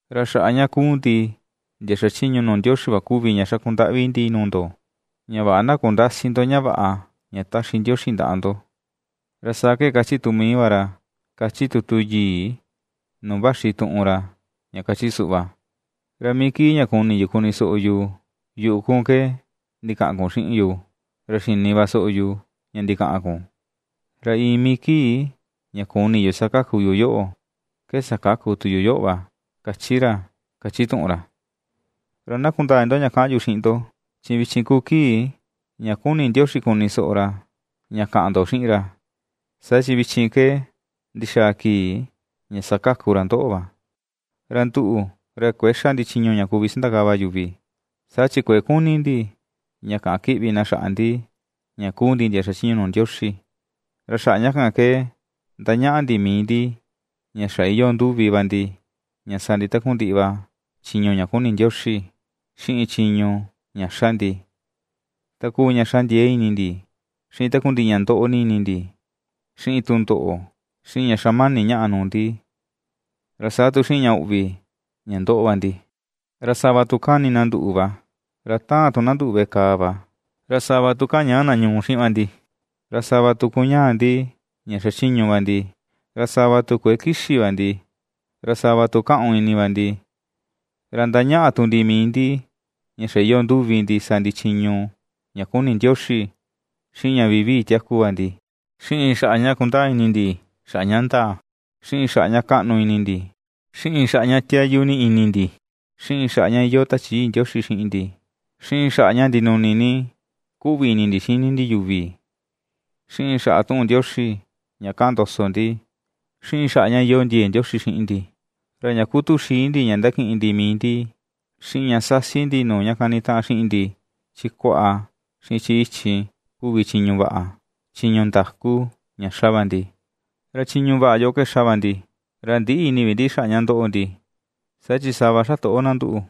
Ra xaꞌa ña kuu ndi ndia xachiñu nuu Ndioxi va kuvi ña xaku ndaꞌvi ndi nuu ndo, ña vaꞌa na kundäsi ndo ña vaꞌa ña ^taxi Ndioxi ndaꞌa ndo. Ra saa ke ^kachi tu mii va ra kachi tutu yii nuu vaxi tuꞌun ra ña kachi suꞌva: Ra mii kii ña kuni yu kuni soꞌo yu yuꞌu kun ke ndikaꞌan kun xiꞌin yu, ra xini va soꞌo yu ña ndikaꞌan kun, ra iin mii kii ña kuni yu sakaku yu yoꞌo, ke sakaku tu yu yoꞌo va, ^kachi ra, kachi tuꞌun ra. Ra na kundaa ini ndo ña kaꞌan yu xiꞌin ndo, chi vichin kuu kii ña kuni Ndioxi kuni soꞌo ra ña kaꞌan ndo xiꞌin ra, saa chi vichin ke ndixaa kii ña sakaku ra ndoꞌo va. Ra nduꞌu, ra kuëe xa ndi chiñu ña kuvi sandakava yuvi, saa chi kuëe kuni ndi ña kaꞌan kiꞌvi na xaꞌa ndi ña kuu ndi ndia xachiñu nuu Ndioxi. Ra xaꞌa ña kan ke ndañaꞌa ndi mii ndi ña xa iyoo nduvi va ndi ña sa ndi takundiꞌi va chiñu ña kuni Ndioxi, xiꞌin chiñu ña xa ndi, ta kuu ña xa ndiee ini ndi, xiꞌin takundiꞌi ña ndoꞌo ni ini ndi, xiꞌin tundoꞌo, xiꞌin ña xamani ñaꞌa nuu ndi, ra saa tu xiꞌin ña uꞌvi ña ^ndoꞌo va ndi. Ra sava tu kani na nduꞌu va; ra taan tu na nduꞌu veꞌe kàà va; ra sava tu kañaꞌa na ñuu xiꞌin va ndi, ra sava tu kuñaa ndi ña xachiñu va ndi; ra sava tu kuëe kixi va ndi, ra sava tu kaꞌun ini va ndi. Ra ndañaꞌa tu ndi mii ndi ña xa iyoo nduvi ndi sa ndi chiñu ña kuni Ndioxi, xiꞌin ña vivii tiaku va ndi, xiꞌin xaꞌa ña kundaa ini ndi xaꞌa ña ndaa, xiꞌin xaꞌa ña kaꞌnu ini ndi, xiꞌin xaꞌa ña tiayu ni ini ndi, xiꞌin xaꞌa ña iyoo Tachi Yii Ndioxi xiꞌin ndi, xiꞌin xaꞌa ña ndinuni ni kuꞌvi ini ndi xini ndi yuvi, xiꞌin xaꞌa tuꞌun Ndioxi ña kaꞌan ndoso ndi, xiꞌin xaꞌa ña iyoo ndiee Ndioxi xiꞌin ndi. Ra ña kuu tuxii ndi ña ndakiꞌin ndi mii ndi, xiꞌin ña sasi ndi nuu ña kanitaꞌan xiꞌin ndi, chi kuaꞌa xiꞌin chi ichi kuvi chiñu vaꞌa, chiñu ndaku ña ^xa va ndi. Ra chiñu vaꞌa yoꞌo ke ^xa va ndi, ra ndïꞌi ini vi ndi xaꞌa ña ndoꞌo ndi, saa chi sava ^xa toꞌo na nduꞌu,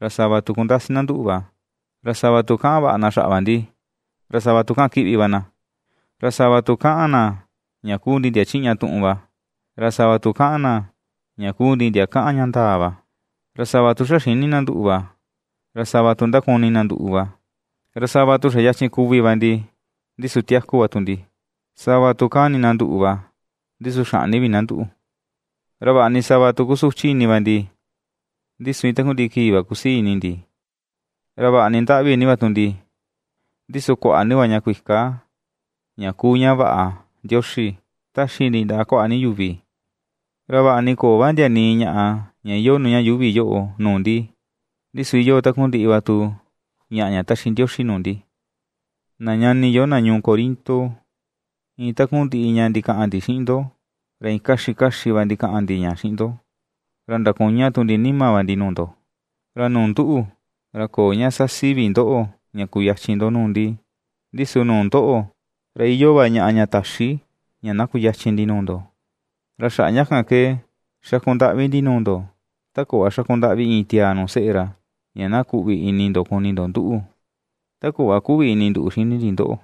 ra sava tu kundasi na nduꞌu va, ra sava tu kaꞌan vaꞌa na xaꞌa va ndi, ra sava tu kaꞌan kiꞌvi va na, ra sava tu kaꞌan na ña kuu ndi ndia chiꞌña tuꞌun va, ra sava tu kaꞌan na ña kuu ndi tiaa ndia kaꞌan ña ndaa va. Ra sava tu ^xa xïni na nduꞌu va, ra sava tu ndakuni na nduꞌu va; ra sava tu xa yachin kuvi va ndi, ndi su tiaku va tu ndi; sava tu kani ni na nduꞌu va, ndi su xäꞌni vi na nduꞌu. Ra vaꞌa ni sava tu kusuchi ini va ndi, ndi su iin takundiꞌi kii va kusii ini ndi, ra vaꞌa ni ndaꞌvi ni va tu ndi, ndi su kuaꞌa ni va ña kuika ña kuu ña vaꞌa Ndioxi, ^taxi ndi ndaꞌa kuaꞌa ni yuvi; ra vaꞌa ni köo va ndia nii ñaꞌa ña iyoo nuu ña yuuvi yoꞌo nuu ndi, ndi su iyoo takundiꞌi va tu ñaꞌa ña taxi Ndioxi nuu ndi. Na ñani yo na ñuu Corinto, iin takundiꞌi ña ndikaꞌan ndi xiꞌin ndo, ra iin kaxi kaxi va ndikaꞌan ndi ña xiꞌin ndo; ra ndakuña tu ndi nima va ndi nuu ndo. Ra nuu nduꞌu, ra köo ñaꞌa sasi vi ndoꞌo ña kuyachin ndo nuu ndi, ndi su nuu ndoꞌo, ra iyoo va ñaꞌa ña täxi ña na kuyachin ndi nuu ndo. Ra xaꞌa ña kan ke xaku ndaꞌvi ndi nuu ndo, ta kuꞌva xaku ndaꞌvi iin tiaa nuu seꞌe ra, ña na kuꞌvi ini ndo kuni ndo nduꞌu, ta kuꞌva kuꞌvi ini nduꞌu xini ndi ndoꞌo.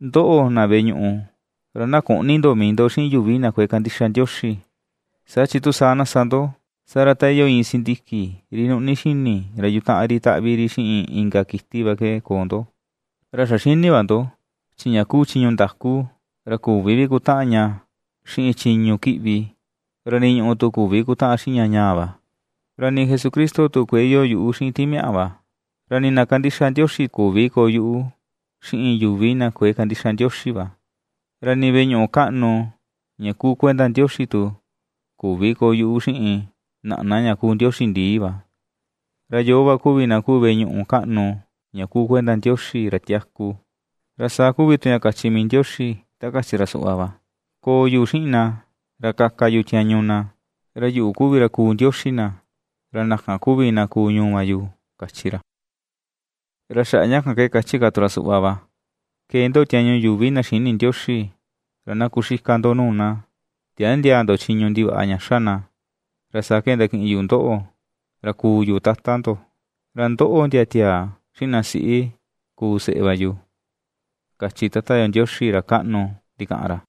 Ndoꞌo, na veꞌe ñuꞌu, ra na küꞌni ndo mii ndo xiꞌin yuvi na kuëe kandixa Ndioxi, saa chi tu saa na sa ndo, saa ra ta iyoo iin sindiki ri nuꞌni xini ra yutaꞌan ri taꞌvi ri xiꞌin inka kiti va ke koo ndo. Ra xa xini va ndo, chi ña kuu chiñu ndaku, ra ^küvi vi kutaꞌan ña xiꞌin chiñu kiꞌvi, ra nii ñùꞌù tu küvi kutaꞌan xiꞌin ña ñaa va. Ra nii Jesucristo tu kuëe iyoo yuꞌu xiꞌin timiaꞌa va, ra nii na kandixa Ndioxi tu küvi koo yuꞌu xiꞌin yuvi na kuëe kandixa Ndioxi va. Ra nii veꞌe ñuꞌu kaꞌnu ña kuu kuenda Ndioxi tu küvi koo yuꞌu xiꞌin naꞌna ña kuu ndioxi ndii va. Ra yoo va kuvi na kuu veꞌe ñuꞌu kaꞌnu ña kuu kuenda Ndioxi, ra tiaku, ra saa kuvi tu ña kachi mii Ndioxi ta kachi ra suꞌva va: Koo yu xiꞌin na, ra kaka yu tiañu na; ra yuꞌu kuvi ra kuu Ndioxi na, ra na kan kuvi na kuu ñuu va yu, kachi ra. Ra xaꞌa ña kan ke, kachi ka tu ra suꞌva va: Kee ndo tiañu yuvi na xïni Ndioxi, ra na kuxika ndo nuu na; Tiändiaa ndo chiñu ndivaꞌa ña xa na. Ra saa ke ndakiꞌin yu ndoꞌo ra kuu yu Tata ndo, ra ndoꞌo ndia tiaa xiꞌin na siꞌi kuu seꞌe va yu, kachi Tata yo Ndioxi ra kaꞌnu ndikaꞌan ra.